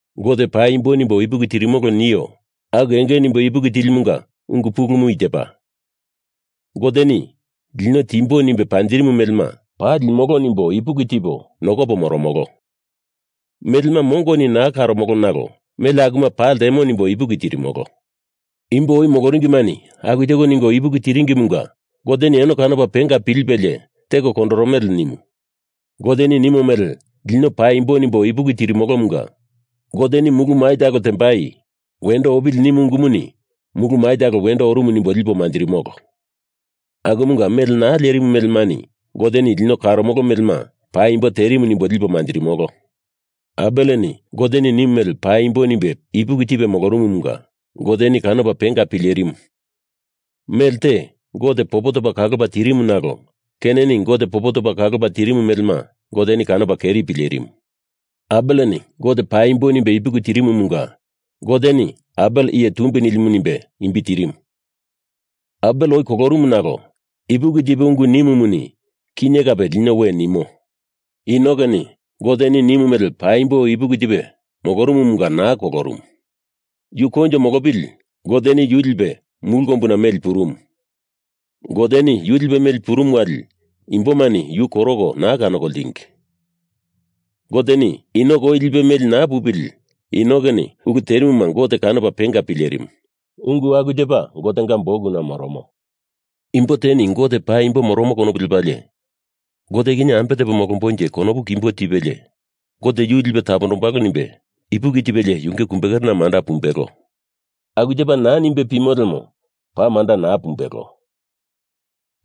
Gote paimbo nimbo ipuki tirimolo nio aku enge nimbe ipuki tilimunga ungu pulumu i tepa, Goteni lino timbo nimbe panjirimu melema paa limolo nimbo ipuki tipo nokopo moromolo. Melema mongoni naa karomolo nalo mele akuma paa ltemo nimbo ipuki tirimolo. Imbo oi moloringimani aku teko ningo ipuki tiringimunga Goteni eno kanopa penga pilipelie teko kondoromele nimu. Goteni nimo mele lino paimbo nimbo ipuki tirimolomunga Goteni mulu mai talo tembai wendo opili nimu ungumuni mulu mai talo wendo orumu nimbo lipo manjirimolo. Akumunga mele naa lerimu melemani Goteni lino karomolo melema paimbo terimu nimbo lipo manjirimolo. Abeleni Goteni nimu mele paimbo nimbe ipuki tilipe molorumumunga Goteni kanopa penga pilerimu mele te Gote popo topa kalopa tirimu nalo Keineni Gote popo topa kalopa tirimu melema Goteni kanopa keri pilerimu. Abeleni Gote paimbo nimbe ipuki tirimumunga Goteni Abel iye tumbi nilimu nimbe imbi tirimu. Abel oi kolorumu nalo ipuki tipe ungu nimumuni kinye kape lino we nimo. Enokeni Goteni nimu mele paimbo nimbe ipuki tipe molorumumunga naa kolorumu. Yu koinjo molopili Goteni yu lipe mulu kombuna meli purumu. Goteni yu lipe meli purumu wali imbomani yu koroko naa kanoko ltingi. Goteni Enok oi lipe meli naa pupili Enokeni ulu terimuma Gote kanopa penga pilerimu, ungu aku tepa Gotenga bukuna moromo. Imbo teni Gote paimbo moromo konopu lepalie Gote kinye ambe tepo molombonje konopu kimbo tipelie, Gote yu lipe tapondombalo nimbe ipuki tipelie yunge kumbekerena manda pumbelo. Aku tepa naa nimbe pimo lemo paa manda naa pumbelo.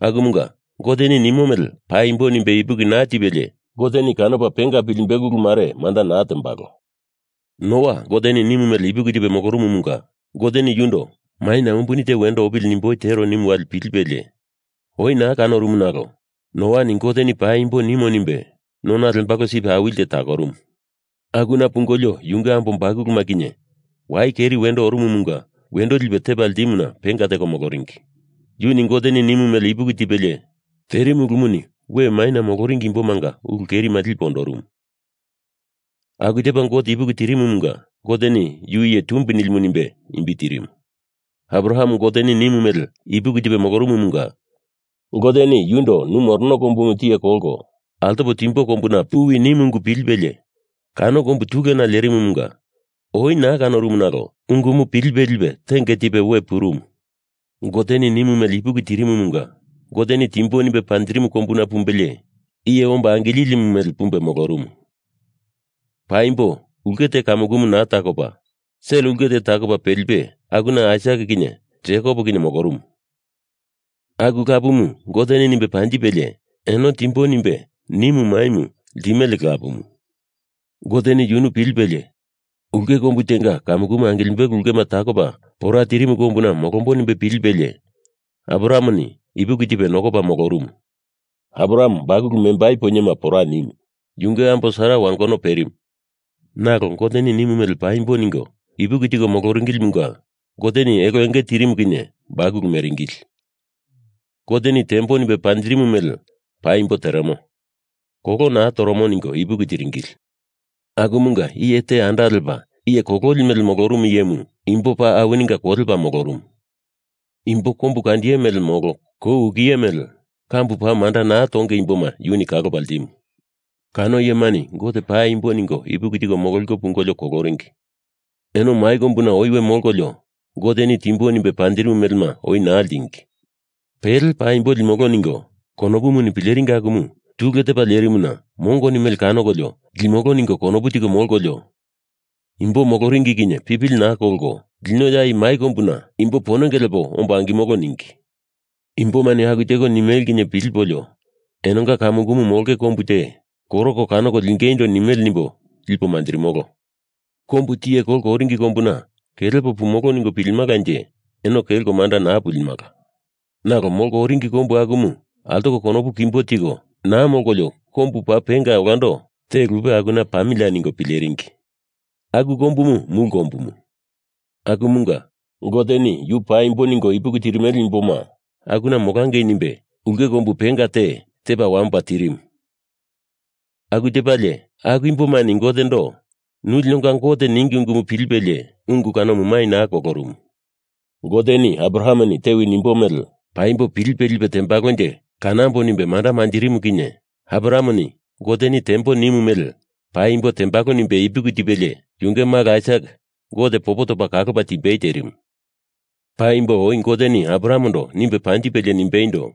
Akumunga Goteni nimo mele paimbo nimbe ipuki naa tipelie Goteni kanopa penga pilimbelo ulu mare manda naa tembalo. Noa Goteni nimu mele ipuki tipe molorumumunga Goteni yundo Maina umbuni te wendo opili nimboi tero nimu wali pilipelie, oi naa kanorumu nalo Noani Goteni paimbo nimo nimbe nona lembalo sip awili te takorumu. Akuna pungolio yunge ambo bakuluma kinye wai keri wendo orumumunga wendo lipe tepa ltimuna penga teko moloringi. Yuni Goteni nimu mele ipuki tipelie terimu ulumuni we maina moloringi imbomanga ulu kerima lipe ondorumu. Aku tepa Gote ipuki tirimumunga Goteni yu iye tumbi nilimu nimbe imbi tirimu. Abraham Goteni nimu mele ipuki tipe molorumumunga Goteni yundo nu morono kombumu tiye kolko altopo timbo kombuna puwi nimu ungu pilipelie kano kombu tulena lerimumunga oi naa kanorumu nalo ungumu pilipe lipe tenge tipe we purumu. Goteni nimu mele ipuki tirimumunga Goteni timbo nimbe panjirimu kombuna pumbelie iye omba angililimu mele pumbe molorumu. Paimbo ulke te kamukumu naa takopa, sel ulke te takopa pelipe akuna Aisak kinye Jekop kinye molorumu. Aku lapumu Goteni nimbe panjipelie eno Timbo nimbe nimu maimu ltimele lapumu. Goteni yunu pilipelie ulke kombu tenga kamukumu angilimbelo ulkema takopa pora tirimu kombuna molombo nimbe pilipelie Abrahameni ipuki tipe nokopa molorumu. Abraham bakulu membai poinyema pora nimu, yunge ambo Sara wangono perimu, nalo Goteni nimu mele paimbo ningo ipuki tiko moloringilimunga Goteni elo enge tirimu kinye bakulu meringili. Goteni tembo nimbe panjirimo mele paimbo teremo, kolo naa toromo ningo ipuki tiringili. Akumunga iye te anda lepa iye kololi mele molorumu iyemu imbo paa awininga kolepa molorumu. Imbo kombukandiye mele molo kou ukiye mele kambu paa manda naa tonge imboma yuni kalopa ltimu. Kano iyemani Gote paimbo ningo ipuki tiko mololiko pungolio koloringi. Eno mai kombuna oi we molkolio Goteni timbo nimbe panjirimu melema oi naa ltingi. Pele paimbo limolo ningo konopuni pileringi akumu tule tepa lerimuna mongoni mele kanokolio limolo ningo konopu tiko molkolio imbo moloringi kinye pipili naa kolko lino ya i mai kombuna imbo ponenge lepo ombo angimolo ningi. Imbomani aku teko nimele kinye pilipolio enonga kamukumu molonge kombu te koroko kanoko lingeindo nimele nimbo lipo manjirimolo. Kombu tiye kolko oringi kombuna kelepo pumolo ningo pilimalanje eno kelko manda pulimala. Nalo molko oringi kombu akumu altoko konopu kimbo tiko naa molkolio kombu paa penga olando te lupe akuna pamilia ningo pileringi. Aku kombumu mulu kombumu. Akumunga Goteni yu paimbo ningo ipuki tirimele imboma akuna molangei nimbe ulke kombu penga te tepa wamopa terimu. Aku tepalie aku imbomani Gotendo nu linonga Gote ningi ungumu pilipelie ungu kanomu mai naa kolorumu. Goteni Abrahameni tewi nimbo mele paimbo pilipe lipe tembalonje kanambo nimbe manda manjirimu kinye Abrahameni Goteni tembo nimu mele paimbo tembalo nimbe ipuki tipelie yunge malo Aisak Gote popo topa kalopa timbei terimu. Paimbo oi Goteni Abrahamendo nimbe panjipelie nimbeindo,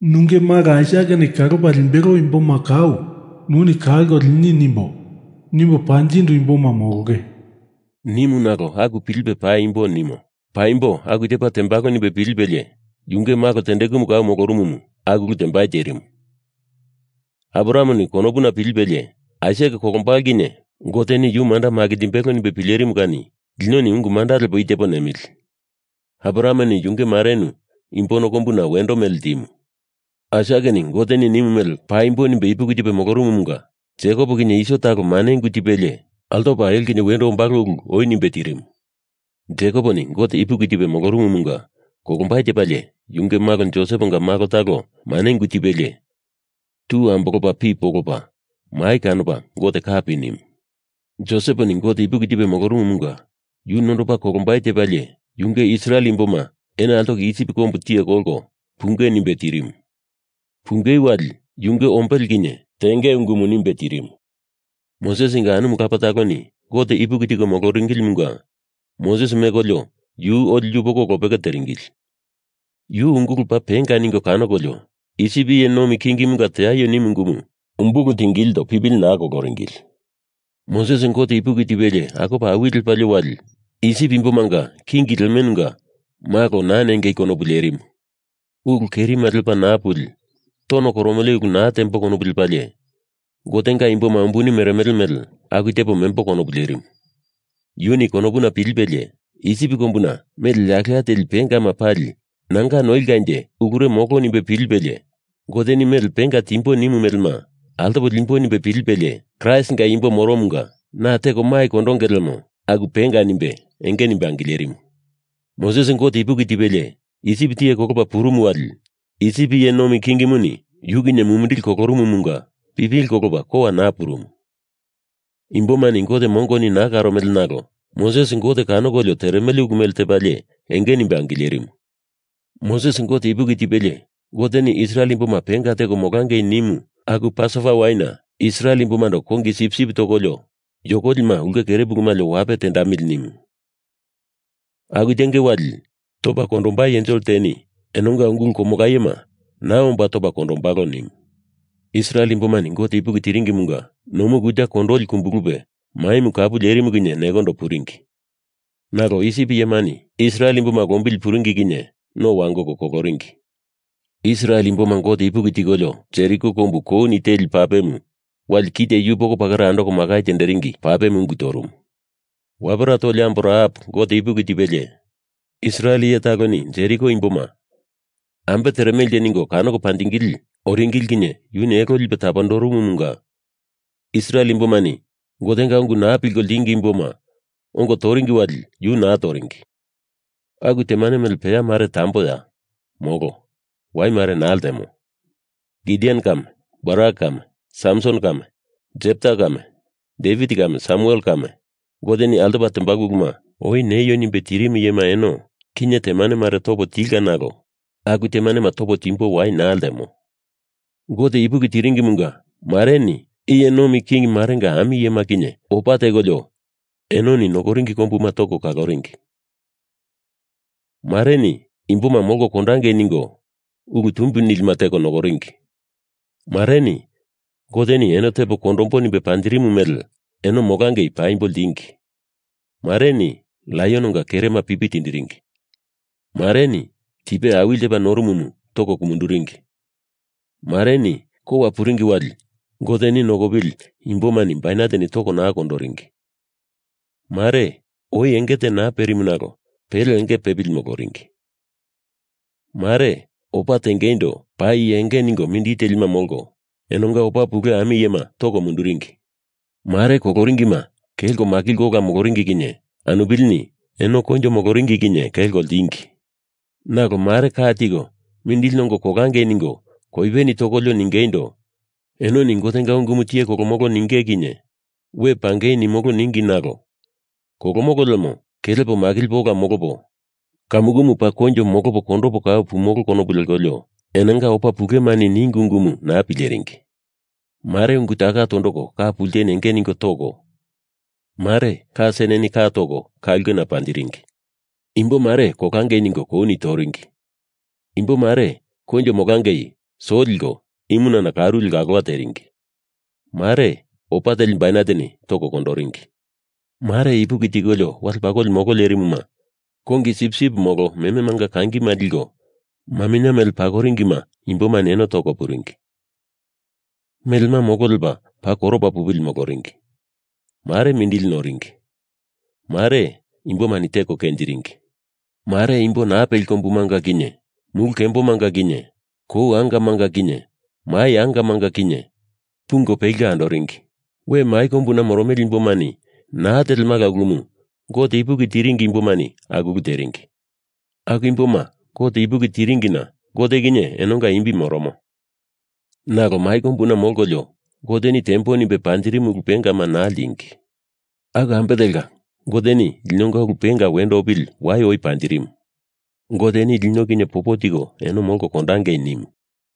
“Nunge malo Aisakeni kalopa limbelo imboma kau nuni kalko lini nimbo, nimbo panjindu imboma molonge,” nimu nalo aku pilipe paimbo nimo, paimbo aku tepa tembalo nimbe pilipelie yunge malo tendekumu kau molorumumu aku ulu tembai terimu. Abrahameni konopuna pilipelie, Aisak kolombalo kinye Goteni yu manda makinjimbelo nimbe pilerimu kani linoni ungu manda lepolio i tepo nemili Abrahameni yunge marenu imbo ono kombuna wendo mele ltimu. Aisakeni Goteni nimu mele paimbo nimbe ipuki tipe molorumumunga Jekop kinye Iso talo mane ungu tipelie altopa elo kinye wendo ombalo ulu oi nimbe tirimu. Jekoponi Gote ipuki tipe molorumumunga kolombai tepalie yunge malo Joseponga malo talo mane ungu tipelie tu ambolopa pi polopa mai kanopa Gote kapi nimu. Joseponi Gote ipuki tipe molorumumunga yu nondopa kolombai tepalie yunge Israel imboma eno altoko Isip kombu tiye kolko punge nimbe tirimu. Punge wali yunge ombele kinye tengei ungumu nimbe tirimu. Mosesinga anumu lapa taloni Gote ipuki tiko moloringilimunga Moses mekolio yu oli yupoko lopeke teringili. Yu ungulu paa penga ningo kanokolio Isip iye nomi kingimunga teaio nimu ungumu umbulu tingilindo pipili naa koloringili. Moses Gote ipuki tipelie akopa awili lepalie wali Isip imbomanga king lemenunga malo naa nengei konopu lerimu. Ulu kerima lepa naa puli tono koromele ulu naa tembo konopu lepalie Gotenga imboma umbuni meremele mele aku tepo membo konopu lerimu. Yuni konopuna pilipelie Isip kombuna mele yakela teli pengama pali nanga noilkanje ulure molo nimbe pilipelie Goteni mele penga timbo nimu melema altopa limbo nimbe pilipelie, Kraistinga imbo moromunga na teko mai kondonge lemo aku penga nimbe enge nimbe angilerimu. Moses Gote ipuki tipelie Isip tiye kolopa purumu wali Isip iye nomi kingimuni yu kinye mumindili kolorumumunga pipili kolopa kowa naa purumu. Imbomani Gote mongoni naa karomele nalo Moses Gote kanokolio teremele ulu mele tepalie enge nimbe angilerimu. Moses Gote ipuki tipelie Goteni Israel imboma penga teko molangei nimu aku Pasova waina Israel imbomando kongi sipsip topolio yokolima ulke kere pulu malio wape tendamili nimu. Aku tenge wali topa kondombai ensel teni enonga ungulu komolayema naa omba topa kondombalo nimu. Israel imbomani Gote ipuki tiringimunga Nomu Kuta Kondoli kumbulupe maimu kapu lerimu kinye nekondo puringi. Nalo Isip iyemani Israel imboma lombili puringi kinye no wangoko koloringi. Israel imboma Gote ipuki tikolio Jeriko kombu kouni teli papemu wali kite yupoko pakera andoko makai tenderingi papemu ungu torumu. Wapera toli ambo Rahap Gote ipuki tipelie Israel iye taloni Jeriko imboma ambe teremelenje ningo kanoko panjingili oringili kinye yuni elo lipe tapondorumumunga Israel imbomani Gotenga ungu naa pilko ltingi imboma ongo toringi wali yu naa toringi. Aku temane mele peya mare tamboya? Molo. Wai mare naa ltemo. Gideon kame Barak kame Samson kame Jepta kame Devit kame Samuel kame Goteni altopa tembalo uluma oi neio nimbe tirimu iyema eno kinye temane mare topo tilka nalo aku temanema topo timbo wai naa ltemo. Gote ipuki tiringimunga mareni iye nomi king marenga ami iyema kinye opa tekolio enoni nokoringi kombuma toko kaloringi. Mareni imboma molko kondangei ningo ulu tumbi nilima teko nokoringi. Mareni Goteni eno tepo kondombo nimbe panjirimu mele eno molangei paimbo ltingi. Mareni laiononga kerema pipi tiringi. Mareni tipe awili tepa norumumu toko kumunduringi. Mareni kowa puringi wali Goteni nokopili imbomani baineteni toko naa kondoringi. Mare oi enge te naa perimu nalo pele enge pepili moloringi. Mare opa tengeindo paa iye enge ningo mindili telima molko, enonga opa pule ami iyema toko munduringi. Mare koloringima kelko makilko ola moloringi kinye anupilini eno koinjo moloringi kinye kelko ltingi. Nalo mare ka tiko mindili nongo kolangei ningo koipeni tokolio ningeindo, enoni Gotenga ungumu tiye kolomolo ninge kinye we pangei nimolo ningi nalo kolomolo lemo kelepo makilipo ola molopo, kamukumu paa koinjo molopo kondopo kau pumolo konopu lekolio enonga opa pulemani ningi ungumu naa pileringi. Mare ungu taka tondoko ka pulteni enge ningo toko, mare ka seneni ka toko ka ulkena panjiringi. Imbo mare kolangei ningo kouni toringi. Imbo mare koinjo molangei so liko imunana karu leko alowa teringi. Mare opa teli baineteni toko kondoringi. Mare ipuki tikolio wale pakoli molo lerimuna kongi sipsip molo mememanga kangima liko maminye mele pakoringima imbomani eno toko puringi. Melema molo lepa paa koropa pupili moloringi. Mare mindili noringi. Mare, imbomani teko kenjiringi. Mare imbo naa peli kombumanga kinye, mulu kembomanga kinye, kou angamanga kinye, mai angamanga kinye, pungo peliko andoringi. We mai kombuna moromele imbomani naa telemala ulumu Gote ipuki tiringi imbomani aku ulu teringi. Aku imboma Gote ipuki tiringina Gote kinye enonga imbi moromo. Nalo mai kombuna molkolio Goteni tembo nimbe panjirimu ulu pengama naa ltingi. Aku ambe telka Goteni linonga ulu penga wendo opili wai oi panjirimu. Goteni lino kinye popo tiko eno molko kondangei nimu.